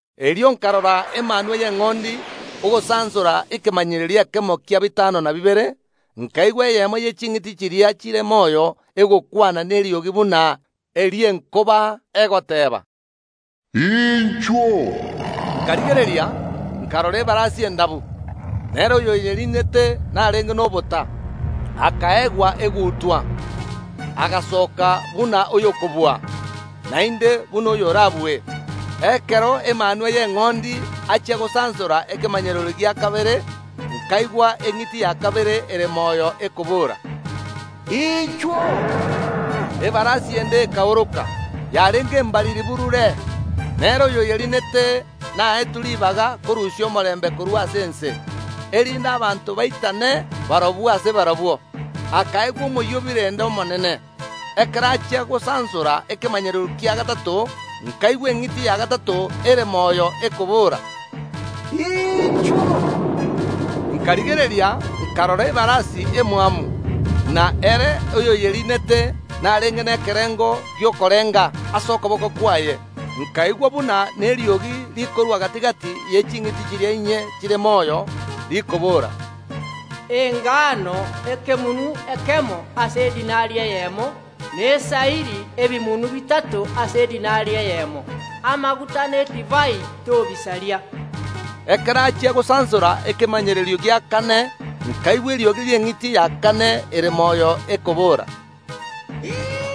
Erio nkarora Emanwa y’Eng’ondi ogosansora ekemanyererio ekemo kia bitano na bibere, nkaigwa eyemo ye ching’iti chiria chire moyo egokwana neriogi buna eri’enkoba, egoteeba, “Inchuo!” Nkarigereria, nkarora ebarasi endabu, na ere oyoyeriinete narenge nobota; akaegwa egutwa, agasoka buna oyokobua, naende buna oyorabue. Ekero Emanwa y’Eng’ondi achia gosansora ekemanyererio gia kabere, nkaigwa eng’iti ya kabere ere moyo ekobora, “Inchuo!” Ebarasi ende ekaoroka, yarenge embariri burure, na ere oyoyeriinete naetwe ribaga korusia omorembe korwa ase ense, erinde abanto baitane barabwo ase barabwo, akaegwa omoyio o birende omonene. Ekero achia gosansora ekemanyererio kia gatato, nkaigwa eng’iti ya gatato ere moyo ekobora, “Inchuo!” Nkarigereria, nkarora ebarasi emwamu, na ere oyoyeriinete narenge nekerengo gi’okorenga ase okoboko kwaye. Nkaigwa buna neriogi rikorwa gati‐gati ye ching’iti chiria inye chire moyo, rikobora, Engano ekemunu ekemo ase edinari eyemo, na esairi ebimunu bitato ase edinari eyemo; amaguta na edivai tobisaria. Ekero achia gosansora ekemanyererio gia kane, nkaigwa eriogi ri’eng’iti ya kane ere moyo ekobora, “Inchuo!”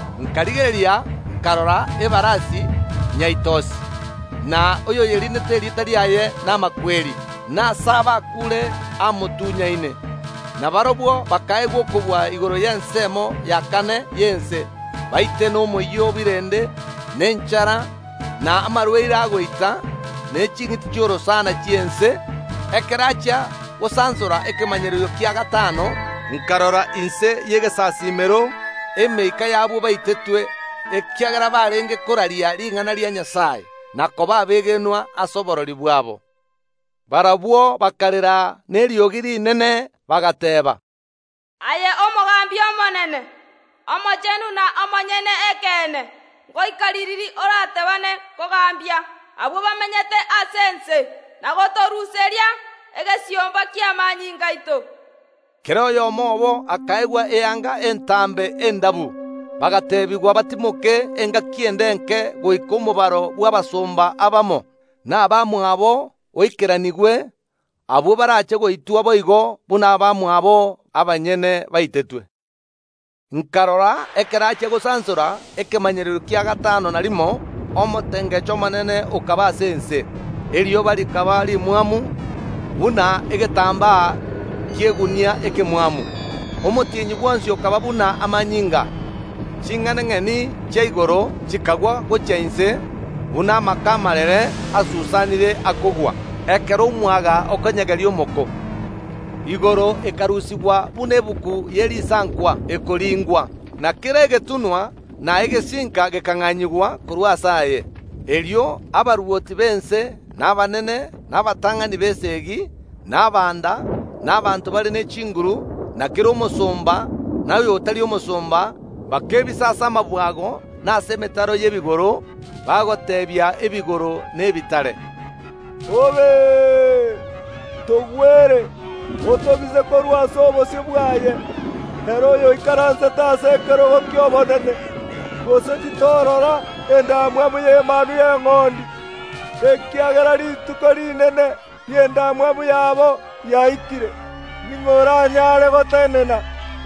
Nkarigereria, nkarora ebarasi nyaitosi, na oyoyeriinete erieta riaye n’Amakweri, na aase abakuure amotunyaine; na barabwo bakaegwa okobua igoro y’ensemo ya kane y’ense, baite nomoyio o birende, na enchara, na amarwaire agoita, ne ching’iti chi’orosana chi’ense. Ekero achia gosansora ekemanyererio kia gatano, nkarora inse y’egesasiimero emeika y’abwo baitetwe ekiagera barenge koraria ring’ana ria Nyasae, na koba abegenwa ase oborori bwabo. Barabwo bakarera neriogi rinene, bagateeba, “Aye Omogambi omonene, omochenu na omonyene ekeene, goika ririri oratebaane kogambia abwo bamenyete ase ense, na gotoruseria egesiomba ki’amanyinga aito?” Kera oyomo obo akaegwa eanga entambe endabu, bagateebigwa batimoke engaki ende enke goika omobaro bw’abasomba abamo, na abamwabo, oikeranigwe, abwo barache goitwa boigo buna barabwo abanyene baitetwe. Nkarora ekero achia gosansora ekemanyererio kia gatano na rimo omotengecho omonene okaba ase ense, erioba rikaba rimwamu buna egetambaa ki’egunia ekemwamu, omotienyi bwonsi okaba buna amanyinga. Ching’enang’eni chia igoro chikagwa gochia ense buna amako amarere asusanire akogwa, ekero omwaga okonyegeria omoko. Igoro ekarusigwa buna egetabu ye risankwa ekoringwa, na kera egetunwa na egesinka gekang’anyigwa korwa aase aye. Erio abarwoti b’ense, na abanene, na abatang’ani b’esegi, na abanda, na abanto bare ne chinguru, na kera omosomba, na oyotari omosomba, bakebisa ase amabwago na ase emetaro y’ebigoro, bagoteebia ebigoro na ebitare, “Togwere, otobise korwa ase obosio bwaye ere oyoikaransete ase ekerogo ki’obonene, gose titorora endamwamu y’Emanwa y’Eng’ondi, ekiagera rituko rinene ri’endamwamu yabo riaikire. Ning’o oranyare gotenena?”